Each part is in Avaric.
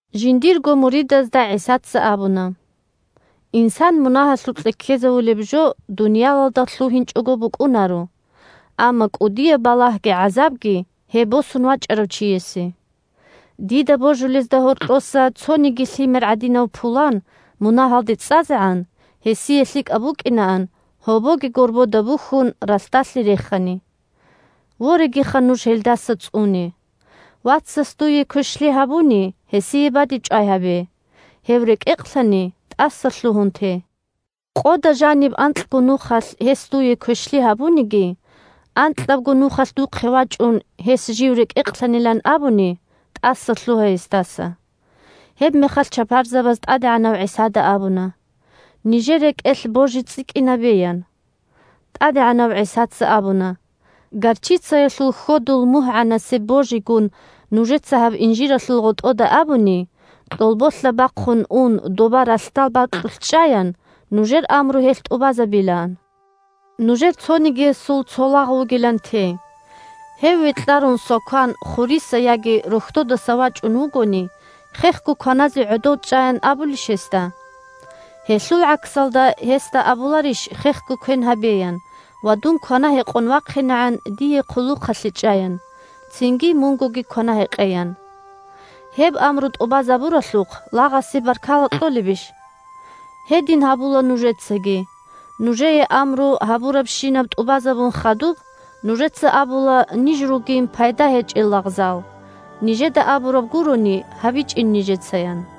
Жиндирго муридазда ГӀисаца абуна: – Инсан мунагьалъукье ккезавулеб жо дуниялалда лъугьинчӀого букӀунаро, амма кӀудияб балагьги гӀазабги – гьеб босун вачӀарав чиясе. Дида божулезда гьоркьоса цониги лъимер гӀадинав пулан мунагьалде цӀазегӀан, гьесие лъикӀаб букӀинаан, гьобоги горбода бухьун, ралъдалъе рехани. Ворегиха, нуж гьелдаса цӀуне. Вацас дуе квешлъи гьабуни, гьесие бадибчӀвай гьабе. Гьев рекӀекълъани, тӀасалъугьун те. Къода жаниб анкьго нухалъ гьес дуе квешлъи гьабуниги, анкьабго нухалъ духъе вачӀун, гьес жив рекӀекълъанилан абуни, – тӀасалъугьа гьесдаса. Гьебмехалъ чапарзабаз ТӀадегӀанав ГӀисада абуна: – Нижер рекӀелъ божи цӀикӀкӀинабе, – ян. ТӀадегӀанав ГӀисаца абуна: – Горчицаялъул хьодул мугьгӀанасеб божигун нужеца гьаб инжиралъул гъотӀода абуни, кьолболъа бахъун ун доба ралъдал бакьулъ чӀаян, нужер амру гьелъ тӀубазабилаан. Нужер цонигиясул цо лагъ вугилан те. Гьев векьарун свакан хуриса яги рохьдодаса вачӀун вугони, хехго кваназе гӀодов чӀаян абулищ гьесда? Гьелъул гӀаксалда, гьесда абуларищ хехго квен гьабеян ва дун квана-гьекъон вахъинегӀан дие хъулухъалъе чӀаян, цинги мунгоги квана-гьекъеян? Гьеб амру тӀубазабуралъухъ лагъасе баркала кьолебищ? Гьедин гьабула нужецаги: нужее амру гьабурабщинаб тӀубазабун хадуб, нужеца абула ниж ругин пайда гьечӀел лагъзал, нижеда абураб гурони гьабичӀин нижецаян.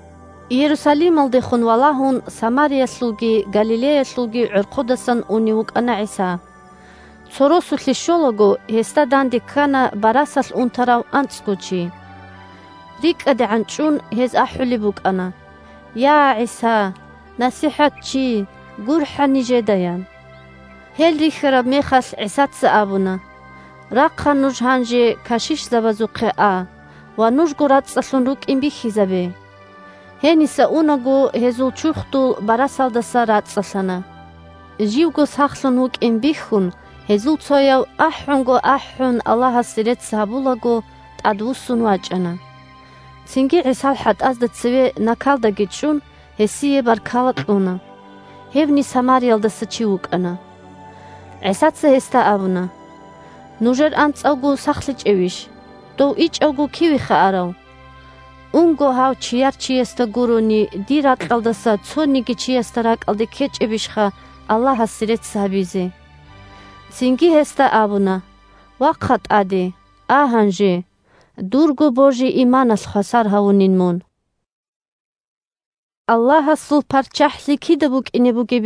Иерусалималдехун валагьун Самариялъулги Галилеялъулги гӀорхъудасан унев вукӀана ГӀиса. Цо росулъе щолаго, гьесда дандеккана барасалъ унтарав анцӀго чи. РикӀкӀадегӀан чӀун, гьез ахӀулеб букӀана: – Я, ГӀиса! НасихӀатчи! ГурхӀа нижеда! – ян. Гьел рихьараб мехалъ, ГӀисаца абуна: – Рахъа нуж гьанже кашишзабазухъе а ва нужго рацӀцӀалъун рукӀин бихьизабе. Гьениса унаго гьезул чурхдул барасалдаса рацӀцӀалъана. Живго сахлъун вукӀин бихьун, гьезул цояв, ахӀунго ахӀун Аллагьасе рецц гьабулаго, тӀадвуссун вачӀана. Цинги, ГӀисал хӀатӀазда цеве накалдаги чӀун, гьесие баркала кьуна. Гьевни Самариялдаса чи вукӀана. ГӀисаца гьесда абуна: – Нужер анцӀавго сахлъичӀевищ? Дов ичӀавго кивеха арав? Унго, гьав чияр чиясда гурони, дир ракьалдаса цониги чиясда ракӀалде ккечӀебищха Аллагьасе рецц гьабизе? Цинги гьесда абуна: – Вахъа тӀаде, а гьанже, дурго божи-иманалъ хвасар гьавунин мун. «Аллагьасул ПарччахӀлъи кида букӀине бугеб?»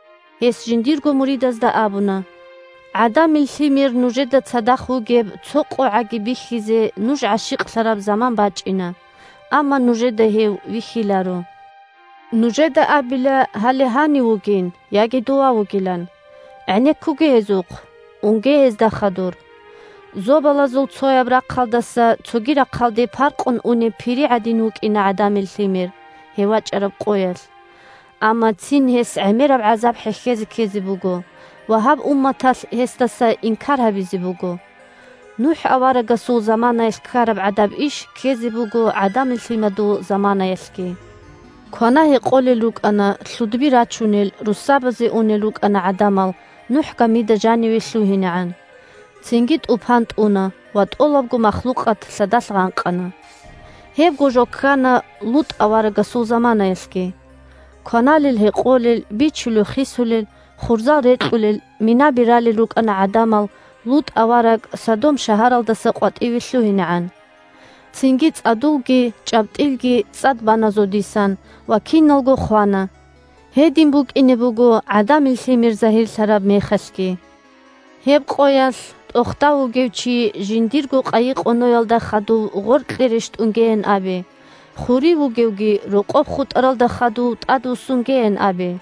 Гьес жиндирго муридазда абуна: – ГӀадамил Лъимер нужеда цадахъ вугеб цо къогӀаги бихьизе нуж гӀащикълъараб заман бачӀина. Амма нужеда гьев вихьиларо. Нужеда абила гьале гьанив вугин, яги дова вугилан. ГӀенеккуге гьезухъ, унге гьезда хадур. Зобалазул цояб рахъалдаса цоги рахъалде паркъун унеб пири гӀадин вукӀина ГӀадамил Лъимер, гьев вачӀараб къоялъ. Амма цин гьес гӀемераб гӀазаб хӀехьезе ккезе буго, ва гьаб умматалъ гьесдаса инкар гьабизе буго. НухӀ аварагасул заманаялъ ккараб гӀадаб иш ккезе буго ГӀадамил Лъимадул заманаялъги. Квана-гьекъолел рукӀана, лъудби рачунел, россабазе унел рукӀана гӀадамал НухӀ гамида жаниве лъугьинегӀан. Цинги тӀупан тӀуна ва тӀолабго махлукъат лъадалъ гъанкъана. Гьебго жо ккана ЛутӀ аварагасул заманаялъги. Кваналел, гьекъолел, бичулел, хисулел, хурзал рекьулел, минаби ралел рукӀана гӀадамал ЛутӀ авараг Содом шагьаралдаса къватӀиве лъугьинегӀан. Цинги цӀадулги чӀабтӀилги цӀад бана зодисан, ва киналго хвана. Гьедин букӀине буго ГӀадамил Лъимер загьирлъараб мехалъги. Гьеб къоялъ тӀохда вугев чи жиндирго къайи-къоноялда хадув гъоркье рещтӀунгеян абе, хурив вугевги рокъоб хутӀаралда хадув тӀадвуссунгеян абе.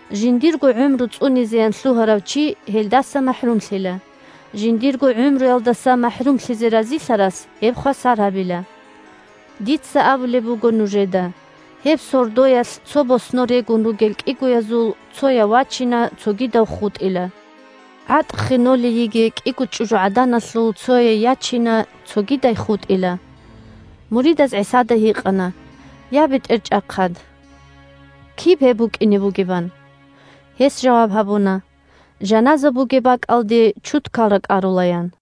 Жиндирго гӀумру цӀунизеян лъугьарав чи гьелдаса махӀрумлъила; жиндирго гӀумруялдаса махӀрумлъизе разилъарас гьеб хвасар гьабила. Дица абулеб буго нужеда: гьеб сордоялъ цо боснор регун ругел кӀигоязул цояв вачина, цогидав хутӀила. ГӀатӀ ххенолей йигей кӀиго чӀужугӀаданалъул цояй ячина, цогидай хутӀила. Муридаз ГӀисада гьикъана: – Я, БетӀерчӀахъад! Киб гьеб букӀине бугеб? – ан. Гьес жаваб гьабуна: – Жаназа бугеб бакӀалде чудкал ракӀарула, – ян.